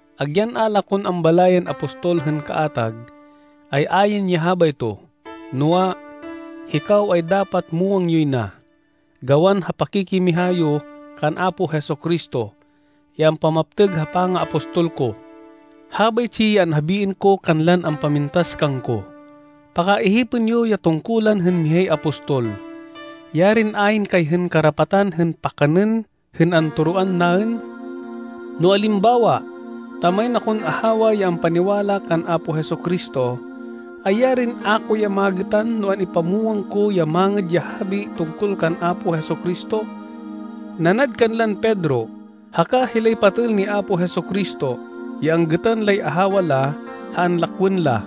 Agyan a la kon ambalayên apostol hên kaatag, ay ayn ya habayto. Noa, hikaw, ay dapat muwang yoy na, gawan ha pakikimiha yo kan Apo Jesu-Cristo, ya ampamaptêg ha pangaapostol ko. Habaytsi ya anhabiên ko kanlan ampamintas kangko. Pakaihipên yo ya tungkulan hên mihay apostol. Yarin ayn kay hên karapatan hên pakanên hên antoroan naên! No alimbawa ta main akon ahawa ya ampaniwala kan Apo Jesu-Cristo, ay yarin a ko ya magêtan no an-ipamwang ko ya Mangêd ya Habi tungkol kan Apo Jesu-Cristo, nanad kanlan Pedro haka hilay patêl ni Apo Jesu-Cristo, ya anggêtan lay ahawa la ha anlakwên la!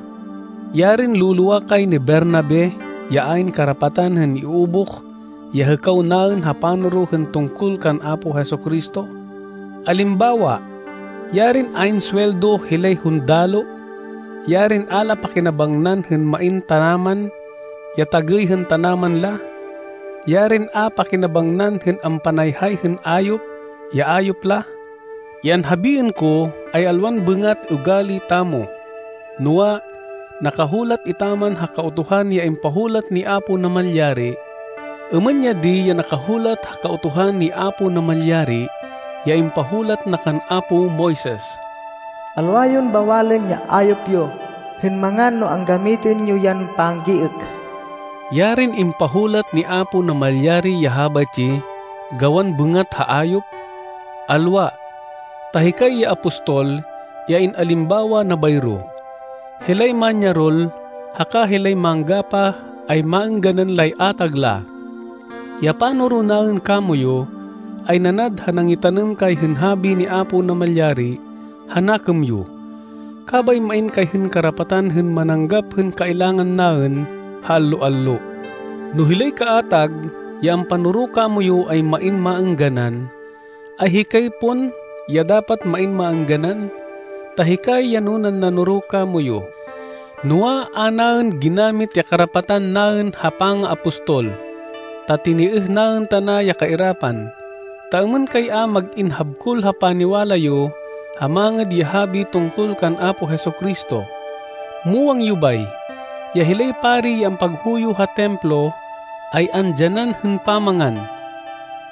Yarin lo-lowa kay ni Bernabe ya ayn karapatan hên iubuh ya hêkaw naên ha panoro hên tungkol kan Apo Jesu-Cristo! Alimbawa, yarin ayn suweldo hilay hundaloh! Yarin a la pakinabangnan hên main tanaman, ya tagêy hên tanaman la! Yarin a pakinabangnan hên ampanayhay hên ayop ya ayop la! Ya anhabiên ko ay alwan bêngat ugali tamo, noa, nakahulat etaman ha Kautuhan ya impahulat ni Apo Namalyari. Êmên ya di ya nakahulat ha Kautuhan ni Apo Namalyari ya impahulat na kan apo Moises: “Alwa yon bawalên ya ayop yo hên mangan no anggamitên yo yan panggiêk.” Yarin impahulat ni Apo Namalyari ya habaytsi gawan bêngat ha ayop! Alwa! Ta hikay ya apostol, ya in-alimbawa na bayro. Hilay manyarol haka hilay manggapah ay maêngganan lay atag la. Ya panoro naên kamoyu ay nanad ha nangitanêm kay hên habi ni Apo Namalyari ha nakêm yo. Kabay main kay hên karapatan hên mananggap hên kailangan naên ha allo-allo. No hilay kaatag ya ampanoro kamoyu ay main maêngganan, ay hikay pon ya dapat main maêngganan, ta hikay ya nunan nanoro kamoyu. Noa, a naên ginamit ya karapatan naên ha pangaapostol, ta tinêêh naên tana ya kairapan, ta êmên kay a mag-in habkol ha paniwala yo ha Mangêd ya Habi tungkol kan Apo Jesu-Cristo. Muwang yo bay, ya hilay pari ya ampaghuyo ha Templo, ay andyanan hên pamangan.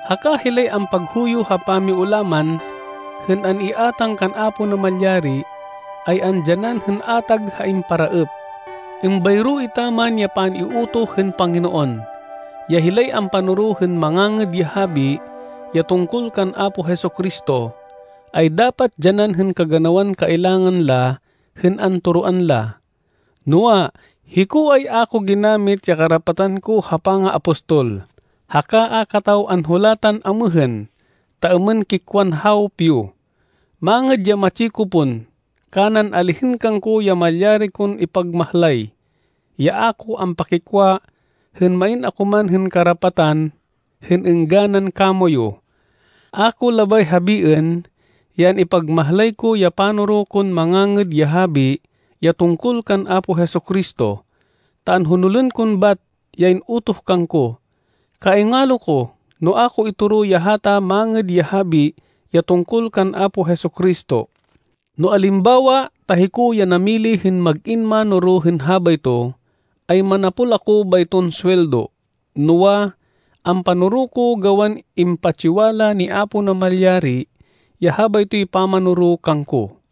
Haka hilay ampaghuyo ha pamiulaman hên an-iátang kan Apo Namalyari, ay andyanan hên atag ha imparaêp. Êmbayro etaman ya pan-iutoh hên Panginoon, ya hilay ampanoro hên Mangangêd ya Habi ya tungkol kan Apo Jesu-Cristo, ay dapat dyanan hên kaganawan kailangan la hên antoroan la. Noa, hiko, ay a ko ginamit ya karapatan ko ha pangaapostol. Haka a kataw anhulatan amêhên, ta êmên kikwan hawop yo. Mangêd ya matsi ko pon, kanan alihên kangko ya malyari kon ipagmahlay, ya a ko ampakikwa hên main ako man hên karapatan hên êngganan kamoyu. A ko labay habiên ya an-ipagmahlay ko ya panoro kon Mangangêd ya Habi ya tungkol kan Apo Jesu-Cristo, ta anhonolên kon bat ya in-utoh kangko. Kaingalo ko no a ko itoro ya hata Mangêd ya Habi, ya tungkol kan Apo Jesu-Cristo. No alimbawa ta hiko ya namili hên mag-in mánoro hên habayto, ay manapol ako bayton suweldo. Noa, ampanoro ko gawan impatsiwala ni Apo Namalyari ya habaytoy pamanoro kangko.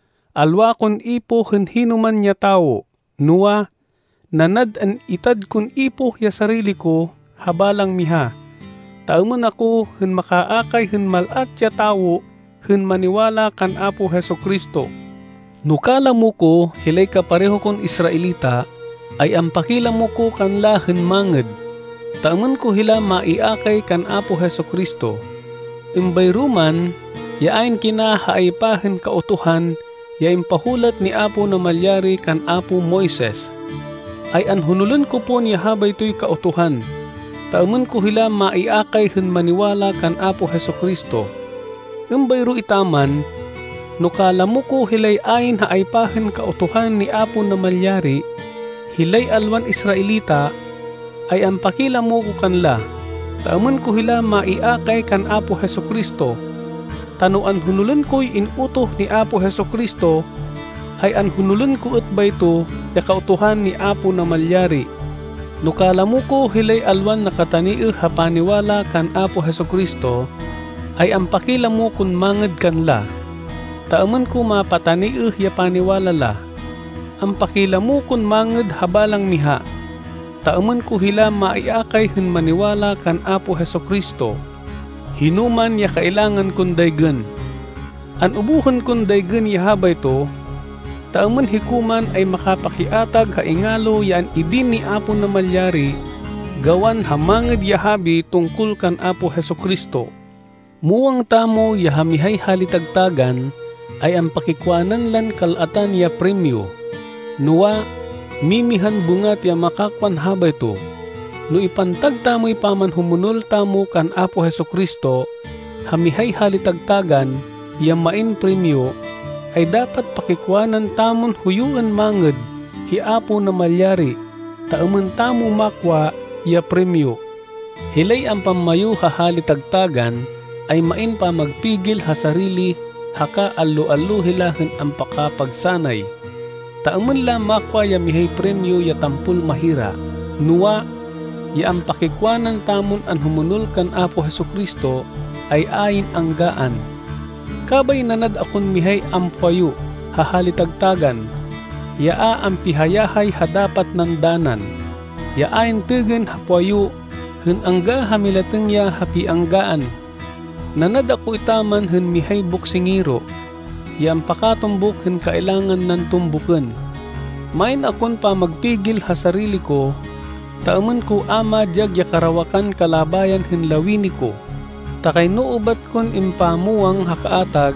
Alwa kon ipoh hên hinoman ya tawo. Noa, nanad an-itad kon ipoh ya sarili ko ha balang miha, ta êmên ako hên makaakay hên mal-at ya tawo hên maniwala kan Apo Jesu-Cristo. No kalamo ko hilay kapareho kon Israelita, ay ampakilamo ko kanla hên mangêd, ta êmên ko hila maiakay kan Apo Jesu-Cristo. Êmbayro man ya ayn kina ha aypa hên Kautuhan ya impahulat ni Apo Namalyari kan apo Moises, ay anhonolên ko pon ya habaytoy Kautuhan, ta êmên ko hila maiakay hên maniwala kan Apo Jesu-Cristo. Êmbayro etaman, no kalamo ko hilay ayn ha aypa hên Kautuhan ni Apo Namalyari, hilay alwan Israelita, ay ampakilamo ko kanla, ta êmên ko hila maiakay kan Apo Jesu-Cristo. Ta no anhonolên koy in-utoh ni Apo Jesu-Cristo, ay anhonolên ko êt bayto ya Kautuhan ni Apo Namalyari. No kalamo ko hilay alwan nakataniêh ha paniwala kan Apo Jesu-Cristo, ay ampakilamo kon mangêd kanla, ta êmên ko mapataniêh ya paniwala la. Ampakilamo kon mangêd ha balang miha, ta êmên ko hila maiakay hên maniwala kan Apo Jesu-Cristo, hinoman ya kailangan kon daygên. An-ubuhên kon daygên ya habayto, ta êmên hiko man ay makapakiatag ha ingalo ya an-idin ni Apo Namalyari gawan ha Mangêd ya Habi tungkol kan Apo Jesu-Cristo. Muwang tamo ya ha mihay hali-tagtágan ay ampakiwanan lan kal-atan ya primyo, noa, mimihan bêngat ya makakwan habayto. No ipantag tamoy pamanhumonol tamo kan Apo Jesu-Cristo ha mihay hali-tagtágan ya main primyo, ay dapat pakikwanan tamon huyuên mangêd hi Apo Namalyari, ta êmên tamo makwa ya primyo. Hilay ampammayu ha hali-tagtágan ay main pamagpigil ha sarili haka allo-allo hila hên ampakapagsanay, ta êmên la makwa ya mihay primyo ya tampol mahira. Noa, ya ampakikwanan tamon anhumonol kan Apo Jesu-Cristo, ay ayn anggaan. Kabay nanad akon mihay ampuwayu ha hali-tagtágan, ya a ampihayahay ha dapat nan danan, ya ayn têgên ha puwayu hên angga ha milatêng ya ha pianggaan. Nanad ako etaman hên mihay boksingero, ya ampakatumbuk hên kailangan nan tumbukên. Main akon pamagpigil ha sarili ko, ta êmên ko a madyag ya karawakan kalabayan hên lawini ko. Ta kayno ubat kon impamwang ha kaatag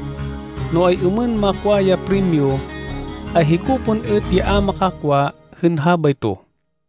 no ay-êmên makwa ya primyo, ay hiko pon êt ya a makakwa hên habayto.